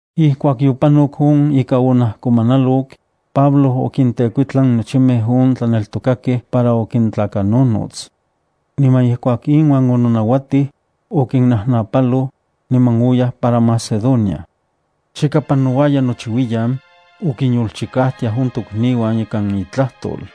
Ijkuak yopanok on ika onajkomanalok, Pablo okintekuitlan nochimej on tlaneltokakej para okintlakanonots. Niman ijkuak inuan ononauatij, okinnajnapaloj, niman oyaj para Macedonia. Chika panouaya nochiuiyan, okinyolchikajtiaj on tokniuan ikan itlajtol.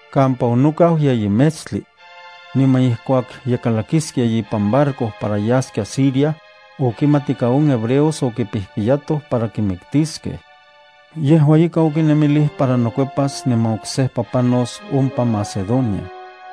kampa onokau yeyi metstli. Niman ijkuak ye kalakiskia ipan barco para yaskia Siria, okimat ika on hebreos okipijpiyatoj para kimiktiskej. Yejua ika okinemilij para nokuepas niman oksejpa panos ompa Macedonia.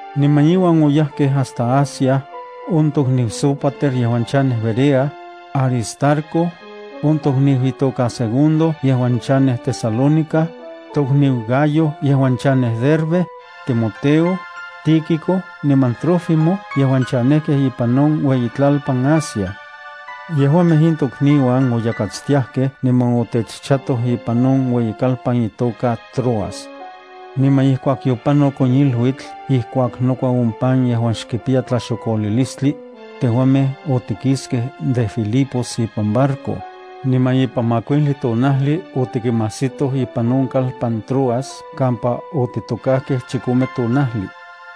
Niman iuan oyajkej hasta Asia, Sópater yejuan chanej Berea, Aristarco niman on tlakat itoka Segundo yejuan chanekej Tesalónica, Gayo yejuan chanej Derbe, Timoteo, Tíquico niman Trófimo yejuan chanejkej ipan iueyitlalpan Asia. Yejuamej in tokniuan oyakatstiajkej niman otechchatoj ipan on ueyikalpan itoka Troas. Niman ijkuak yopanok on iluitl ijkuak nokua on pan yejuan xkipiya tlaxokolilistli, tejuamej otikiskej de Filipos ipan barco, niman ipan makuijli tonajli otikinmajsitoj ipan on ueyikalpan Troas kampa otitokajkej chikome tonajli.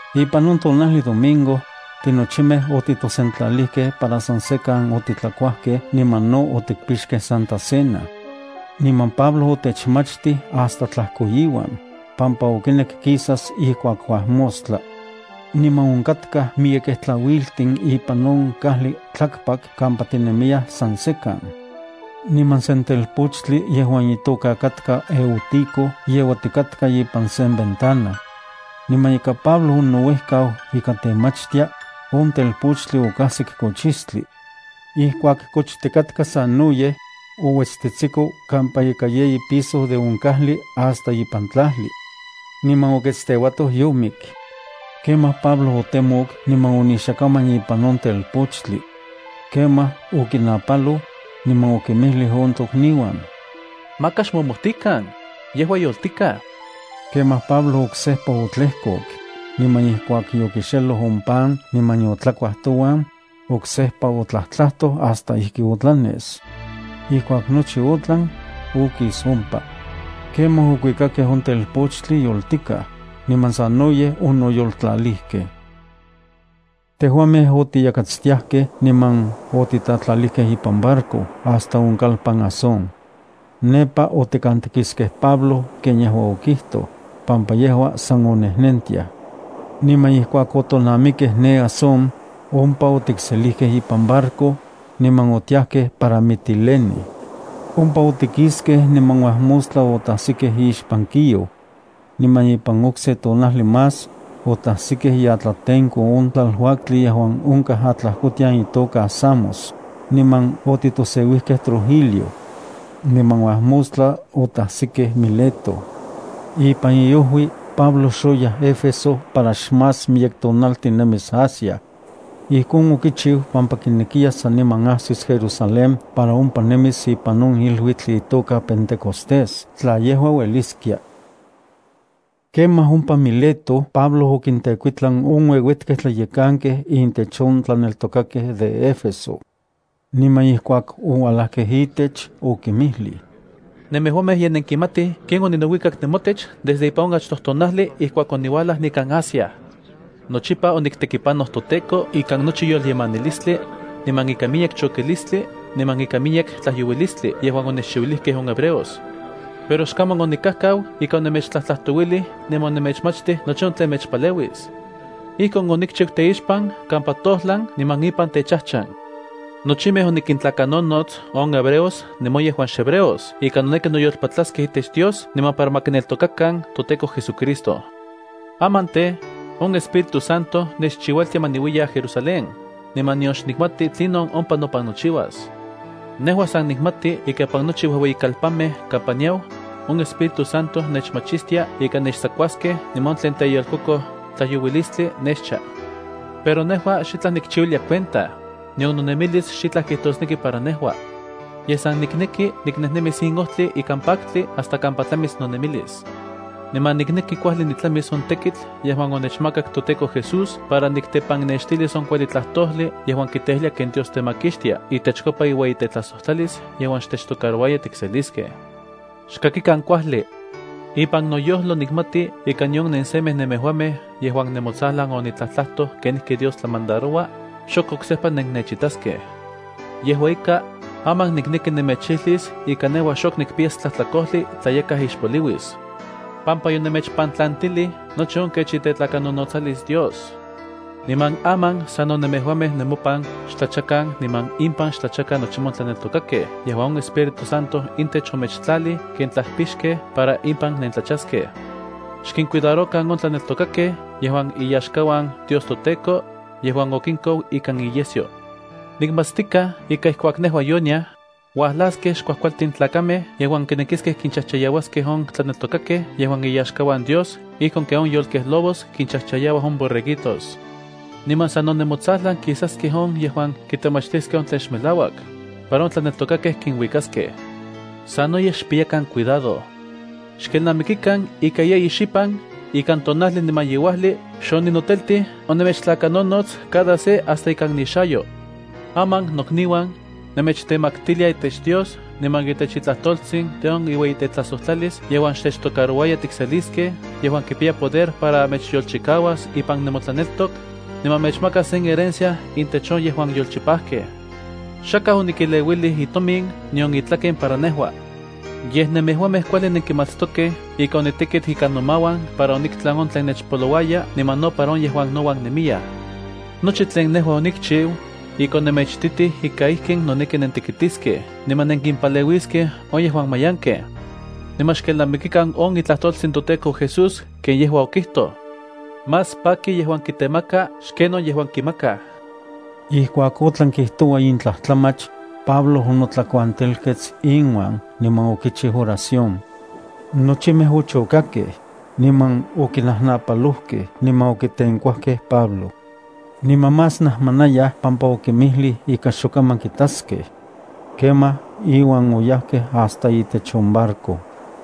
Ipan on tonajli domingo, tinochimej otitosentlalijkej para san sekan otitlakuajkej niman no otikpixkej Santa Cena. Niman Pablo otechmachtij hasta tlajkoiuan, pampa okinek kisas ijkuak uajmostla. Niman onkatkaj miyekej tlauiltin ipan on kajli tlakpak kampa tinemiyaj san sekan. Niman sen telpochtli yejuan itoka katka Eutico yeuatikatka ipan sen ventana. Niman ika Pablo onouejkau ika temachtia, on telpochtli okajsik kochistli. Ijkuak kochtikatka sanoyej, ouetstetsiko kampa ika yeyi piso de on kajli hasta ipan tlajli. Niman oketsteuatoj yomik. Kemaj Pablo otemok niman onixakaman ipan on telpochtli. Kemaj okinapaloj, niman okinmijlij on tokniuan: —Maka xmomojtikan, yejua yoltikaj. Kemaj Pablo oksejpa otlejkok, niman ijkuak yokixeloj on pan niman yotlakuaj touan, oksejpa otlajtlajtoj hasta ijki otlanes. Ijkuak nochi otlan, okis ompa. Kemaj okuikakej on telpochtli yoltikaj, niman sanoyej onoyoltlalijkej. Tejuamej otiyakatstiajkej niman otitatlalijkej ipan barco hasta on kalpan Asón. Nepa otikantikiskej Pablo ken yejua okijtoj, pampa yejua san onejnentiaj. Niman ijkuak otonamikej ne Asón, ompa otikselijkej ipan barco, niman otiajkej para Mitilene. Ompa otikiskej, niman uajmostla otajsikej ixpan Quío. Niman ipan okse tonajli más, otajsikej iatlatenko on tlaluaktli yejuan onkaj atlajkotian itoka Samos, niman otitoseuijkej Trogilio. Niman uajmostla otajsikej Mileto. Ipan iojui, Pablo xoyaj Éfeso para xmás miyek tonaltin nemis Asia. Ijkon okichiu pampa kinekiya saniman ajsis Jerusalén para ompa nemis ipan on iluitl itoka Pentecostés tla yejua ueliskia. Kemaj ompa Mileto Pablo okintekuitlan on ueuetkej tlayekankej intech on tlaneltokakej de Éfeso. Niman ijkuak ouajlajkej itech okinmijlij: —Nemejuamej ye nenkimatij ken oninouikak nemotech desde ipan on achtoj tonajli ijkuak oniuajlaj nikan Asia. Nochipa oniktekipanoj toTEKO ikan nochi yolyemanilistli, niman ikan miyek chokistli niman ika miyek tlajyouilistli yejuan onechchiuilijkej on hebreos. Pero xkaman onikajkau ika onemechtlajtlajtouilij niman onemechmachtij nochi on tlen mechpaleuis. Ijkon onikchiu teixpan kampa tojlan niman ipan techajchan. Nochimej onikintlakanonots on hebreos niman on yejuan xhebreos ika noneki noyolpatlaskej itech Dios niman para ma kineltokakan toTEKO JesuCristo. ’Aman tej, on Espíritu Santo nechchiualtia ma niuiya Jerusalén, niman nion nikmati tlinon ompa nopan nochiuas. Nejua san nikmati ika ipan nochi uejueyikalpanmej kampa niau, on Espíritu Santo nechmachistia ika nechtsakuaskej niman on tlen teyolkokoj tlajyouilistli nechcha. Pero nejua xitlaj nikchiuilia cuenta, nion nonemilis xitlaj kijtosneki para nejua. Yej san nikneki niknejnemis in ojtli ikan paktli hasta kampa tlamis nonemilis. Niman nikneki kuajli nitlamis on tekitl yejuan onechmakak toTEKO Jesús para niktepannextilis on kuajli tlajtojli yejuan kiteijlia ken Dios temakixtia itechkopa iueyitetlajsojtlalis yejuan xtechtocarouaya tikseliskej. ’Xkakikan kuajli. Ipan noyojlo nikmati ika nion nensemej nemejuamej yejuan nemotsajlan onitlajtlajtoj kenijki Dios tlamandaroua, xok oksejpa nennechitaskej. Yejua ika, aman nikneki nemechilis ika nejua xok nikpiyas tlajtlakojli tla yakaj ixpoliuis, pampa yonemechpantlantilij nochi on kech itetlakanonotsalis Dios. Niman aman sano nemejuamej nemopan xtlachakan niman impan xtlachakan nochimej on tlaneltokakej yejuan on Espíritu Santo intech omechtlalij ken tlajpixkej para impan nentlachaskej. Xkincuidarokan on tlaneltokakej yejuan iyaxkauan Dios toTEKO, yejuan okinkou ikan iyesyo. Nikmatstikaj ika ijkuak nejua yoniaj, uajlaskej xkuajkualtin tlakamej yejuan kinekiskej kinchajchayauaskej on tlaneltokakej yejuan iyaxkauan Dios ijkon ken on yolkej lobos kinchajchayauaj on borreguitos. Niman sano nemotsajlan kisaskej on yejuan kitemachtiskej on tlen xmelauak, para on tlaneltokakej kinuikaskej. Sanoyej xpiyakan cuidado. Xkelnamikikan ika yeyi xipan ikan tonajli niman yeuajli xoninoteltij onemechtlakanonots cada se hasta ikan nixayo. ’Aman, nokniuan, nemechtemaktilia itech Dios niman itech itlajtoltsin de on iueyitetlajsojtlalis yejuan xtechtocarouaya tikseliskej yejuan kipiya poder para mechyolchikauas ipan nemotlaneltok, niman mechmakas sen herencia intech on yejuan yolchipajkej. Xakaj onikeleuilij itomin nion itlaken para nejua. Yej nemejuamej kuajli nenkimatstokej ika onitekit ikan nomauan para oniktlan on tlen nechpolouaya niman no para on yejuan nouan nemiyaj. Nochi tlen nejua onikchiu, ika onemechititij ika ijkin noneki nentekitiskej niman nenkimpaleuiskej on yejuan mayankej. Niman xkelnamikikan on itlajtoltsin toTEKO Jesús ken yejua okijtoj: “Más paki yejuan kitemaka xken on yejuan kiselia.” Ijkuak otlan kijtoua in tlajtlamach, Pablo onotlakuantelkets inuan niman okichiu oración. Nochimej ochokakej, niman okinajnapalojkej niman okitenkuajkej Pablo. Niman más najmanayaj pampa okinmijlij ika xok kaman kitaskej. Kemaj iuan oyajkej hasta itech on barco.